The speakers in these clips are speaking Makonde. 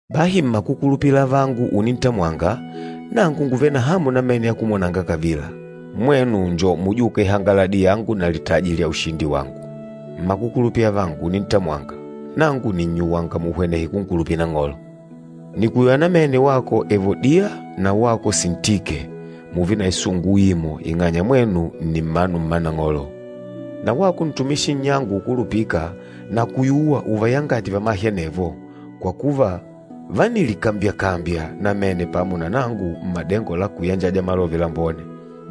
Bahi mmakukulupila avangu unintamwanga, nangu ngùvele na hamu namene ya kumwonanga kavila. Mwenu nni mujûka ihangaladi yangu na litaji lya ushindi wangu. Mmakukulupila avangu unintamwanga, nangu nìnnyuwanga muhwenehe kunkulupila Nang'olo. Nìkuyuwa namene wako Evodiya na wako Sintike, mùùve na isungu uimo ing'anya mwenu nni mmanu mma Nang'olo. Na wako ntumishi nnyangu ukulupîka, nakuyuwa uvayangate vamahe anevo, kwa kuva vánilikambyakambya namene pamo na nangu mmadengo la kuyanjaja Malove Lambone.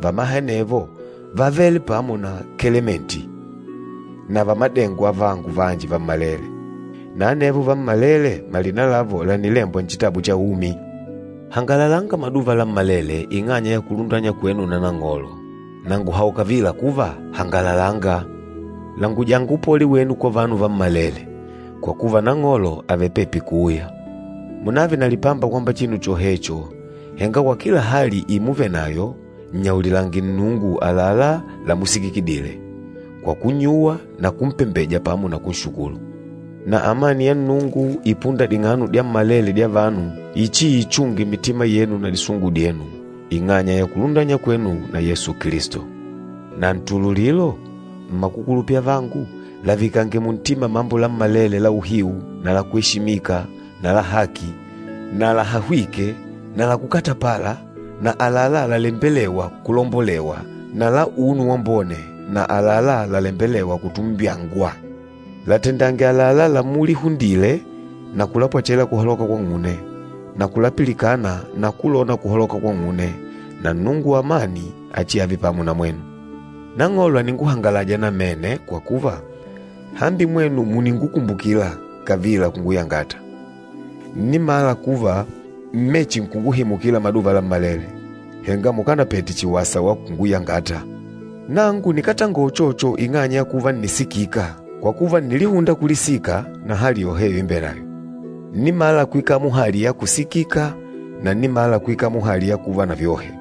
Vamahe anevo vávele pamo na Kelementi na vamadengo avangu vanji vammalele, na anevo vammalele malina lavo lànilembwa Nchitabu cha Umi. Hangalalanga maduva lammalele ing'anya ya kulundanywa kwenu na Nang'olo. Na ngùhaula kavila kuva, hangalalanga! Langujanga upole wenu kwa vanu vammalele, kwa kuva Nang'olo àvele pepi kuuya. Munààve na lipamba kwamba chinu chohecho, henga kwa kila hali imuvenayo, nnyaulilange Nnungu àlalá lamusikikidile, kwa kunnyuwa na kumpembeja pamo na kunshukulu. Na amani ya Nnungu ipûnda ding'ano dyammalele dya vanu, ichiichunge mitima yenu na disungu dyenu, ing'anya ya kulundanywa kwenu na Yesu Kilisto. Na ntululilo, mmakukulupila avangu, lavikange muntima mambo lammalele la uhiu na la kweshimika na la haki na lahahwîke na la kukatapala na àlalá lalembelêwa kulombolewa na la unu wambone na àlalá lalembelêwa kutumbyangwa. Latendange àlalá lamulihundile na kulapwechela kuhaloka kwang'une, na kulapilikana na kulona kuhaloka kwang'une, na Nnungu wa amani achiave pamo na mwenu. Nang'olo àninguhangalaja namene kwa kuva, hambi mwenu mùningukumbukila kavila kunguyangata. Ǹnimala kuva ḿmechinkunguhimukila maduva lammalele, henga mukanapete chihi wasa wa kunguyangata. Nangu nikátangola uchocho ing'anya ya kuva ǹnisikika, kwa kuva ǹnilihunda kulisika na hali yoheyo imbenayo. Ǹnimala kwikala muhali ya kusikika na ǹnimala kwikala muhali ya kuva na vyohe.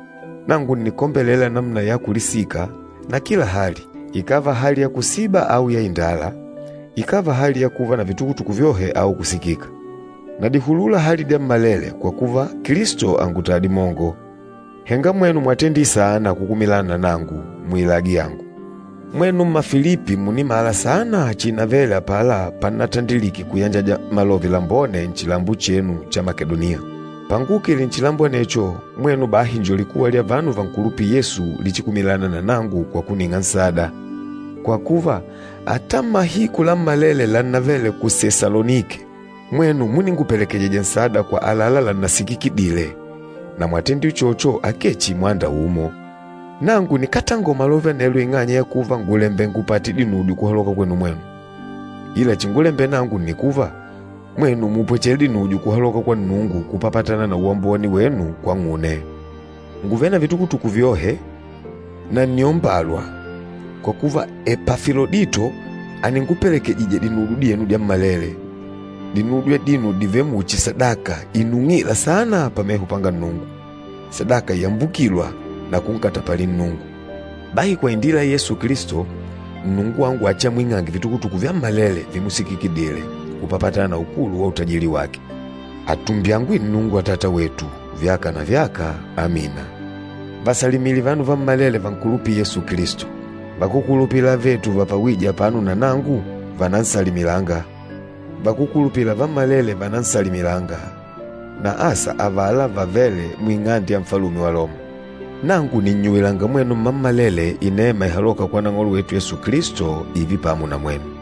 Nangu ǹnikombelela namuna ya kulisika na kila hali, ikàva hali ya kusiba au ya indala, ikàva hali ya kuva na vitukutuku vyohe au kusikika. Nadihulula hali dyammalele kwa kuva, Kilisto àngutaya dimongo. Henga mwenu mwatendile saana kukumilana na nangu muilagi yangu. Mwenu Mmafilipi mùnimala saana chiinavele apala pannatandilike kuyanjaja Malove Lambone nchilambo chenu cha Makedoniya. Panguukile nchilambo anecho, mwenu bahi njo likuwa lya vanu vankulupîla Yesu lichikumilana na nangu kwa kuning'a nsada. Kwa kuva, ata mahiku lammalele lannavele ku Sesalonike, mwenu múningupelekejija nsada kwa àlalá lannasikikidile, na mwatendile uchocho akee chihi mwanda umo. Nangu nikátangola malove anelo ing'anya ya kuva ngùlembela ngupate dinudyo kuhaloka kwenu mwenu. Ila chingulembela nangu nni kuva, mwenu mupwechele dinudyo kuhaloka kwa Nnungu kupapatana na uwambone wenu kwang'une. Ngùvele na vitukutuku vyohe, na ǹniombalwa, kwa kuva Epafilodito àningupelekejija dinudyo dyenu dyammalele. Dinudyo adino dìvele muchi sadaka inung'îla saana pameho panga Nnungu, sadaka iyambukîlwa na kunkatapalila Nnungu. Bahi kwa indila ya Yesu Kilisto, Nnungu wangu achiamwing'ange vitukutuku vyammalele vimusikikidile, kupapatana na ukulu wa utajili wake. Atumbyangwe Nnungu Atata wetu, vyaka na vyaka. Amina. Vasalimile vanu vammalele vankulupîla Yesu Kilisto. Vakúkulupila avetu vapawije apano na nangu, vànansalimilanga. Vakúkulupila vammalele vànansalimilanga, na asa avala vavêle muing'ande ya Nfalume wa Loma. Nangu nìnnyuwilanga mwenu mmammalele inema ihalôka kwa Nang'olo wetu Yesu Kilisto ììve pamo na mwenu.